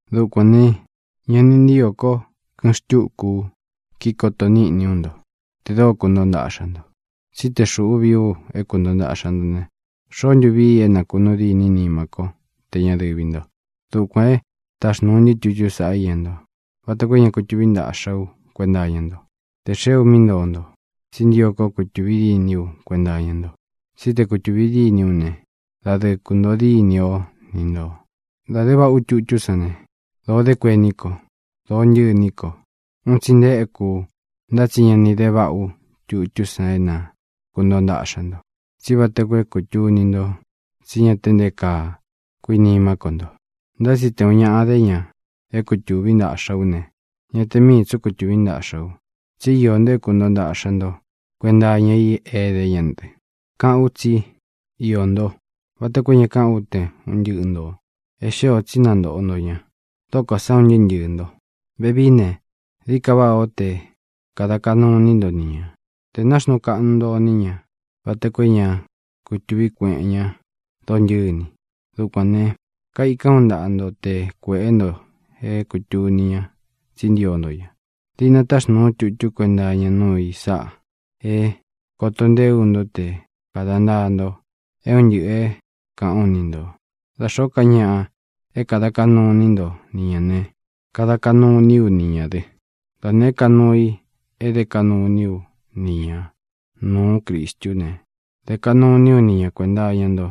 Dukuān ne, ña ni ntíō kó kɨꞌɨn xtúku u kíkoto níꞌni ú nto tē dóo kuntoo ntaꞌxa nto. Tsí te xūꞌú vii u é kuntoo ntaꞌxa nto ne, ¿xoó ntu vii i é nakunuu dîní nimá ko, tē ña dɨvi nto? Dukuān e táxnūu ntɨ́ tutú san iña nto, vata koo é ña kutuví ntaꞌxa ú kuenta iña nto te xee ú mí ntoo nto, tsí ntio kó kutūvi dîní u kuenta iña nto. Tsí te kutūvi dîní u ne, dadɨɨ kūntoo dîni ó ni ntō. Dā dé vaꞌá u tutú san ne, dōo dé kuení ko, dōo ntɨ́ꞌɨ iní ko. Un tsi nte éku u. Ntá tsi ña ni de váꞌā ú tutú san é na kūntoo ntaꞌxa nto, tsí vata koo é kūtuni nto tsí ña te nté kaa kuinimá ko nto. Ntá tsi te ūun ñaꞌa dé ña é kutūví ntaꞌxa ú ne, ñá te miī tsú kutuví ntaꞌxa u, tsí iō ntó é kūntoo ntaꞌxa nto kuénta iña i é edé ña dɨ. Káꞌān ú tsi “iō ntó” vata koo é ña káꞌan ú te un ntɨꞌɨ ntō. E xée ō tsi é nantōꞌo nto ña, dókō sá un ntɨɨ́ ntɨɨ̄ nto. Vevií ne, dií ka váꞌā ó te kāda kaꞌnu iní nto ni ñā, te nāxnuu kaꞌnu nto iní ña vata koo é ña kutuví kueꞌen ñá dontɨ́ni. Dukuān ne, kaikán u ntaꞌa nto te kuēꞌé nto é kūtuni ña tsí ntio nto ña. Diꞌna táxnūu ú tutú kuenta iña núu i sáꞌa é kōto ntee ú nto te kāda ntaa nto é un ntɨꞌɨ̄ é kāꞌán u ni ntō. Da xōó ka ñaꞌa é kāda kaꞌnu iní nto ni ñā ne, kada kaꞌnu iní u ni ñā dɨ. Da nēé ka nuu i é dé kaꞌnu iní u ni ñāꞌa nuú Cristú ne, dē kaꞌnu iní u ni ña kuēnta iña nto,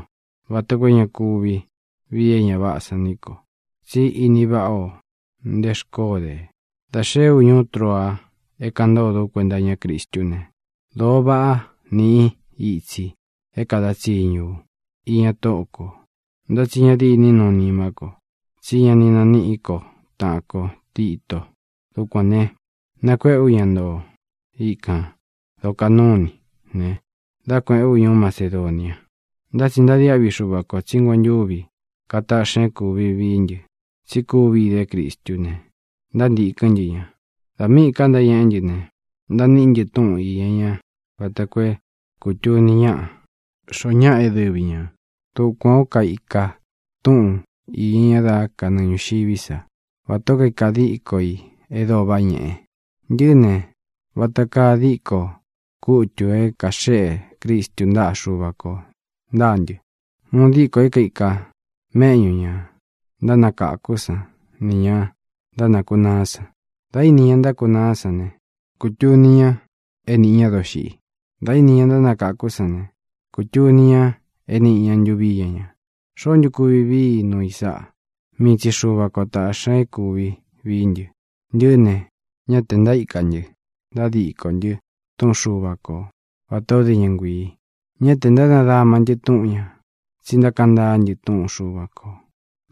vata koo é ña kuvi vii é ña váꞌā san ni ko. Tsí ini váꞌa ō nté xkoó de. Dā xeé u ñuú Troa é kāꞌan ntódō ú kuenta iñá Cristú ne, dōo váꞌa niꞌi itsi é kada tsiñu ú iña Tóꞌo kō. Ntá tsi ña dîní nuu nimá ko, tsí ña ni naníꞌi ko taꞌan kō Tito. Dukuān ne, nakuéꞌe ú ña ntoo ikān dokaꞌnú iní ne, dá kuēꞌén u ñuú Macedonia. Ntá tsi ntadiáꞌvi Xuva kō tsí nguentúvi kataꞌxi ña é kūvi vií ntɨ, tsi kúvi dé Cristú ne, ntántīkɨ́n ntɨ ña. Dā míꞌī ka ntáñeꞌé ntɨ ne, ntaíníꞌi ntɨ túꞌun īña ña vata koo é kūtuni ñáꞌa xoo ñáꞌa é dɨvi ñā. Dukuān ó kaika túꞌūn iña ña dá kanɨɨ ñūxiví sa, vatā ó kaika diko i e dóo váꞌa ñeꞌe. Ntɨꞌɨ́ ne, vata kaa díkō kutu é kaxéꞌe Cristu ntáꞌa Xuva kō ntáa ntɨ, uun díkō i é kaika méꞌñū ña ntánakáku san nī ña ntákunaá san. Dā íni ña ntákunaá san ne, kutuni ña é nīꞌi ña dóxiꞌi. Dā íni ña ntánakáku sán ne, kutuni ña é nīꞌi ña ntuvi íña ña. ¿Xoó ntu kuvi vií i nuu i sáꞌa? Mii tsi Xuva ko tāꞌxi ña é kūvi vií ntɨ. Ntɨꞌɨ́ ne, ñá tē ntaíka ntɨ ntádikō ntɨ túꞌun Xuva ko vatā ó de ña nguīi. Ñá tē ntánadama ntɨ́ túꞌun ñā, tsi ntákaꞌan ntaá ntɨ túꞌun Xuva kō,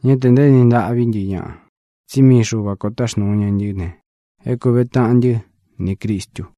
ñá tē ntaéni ntaꞌví ntɨ ñaꞌa. Tsí mii Xuva kō táxnūu ña ntɨ́ ne, é kūve taꞌan ntɨ́ nī Cristu.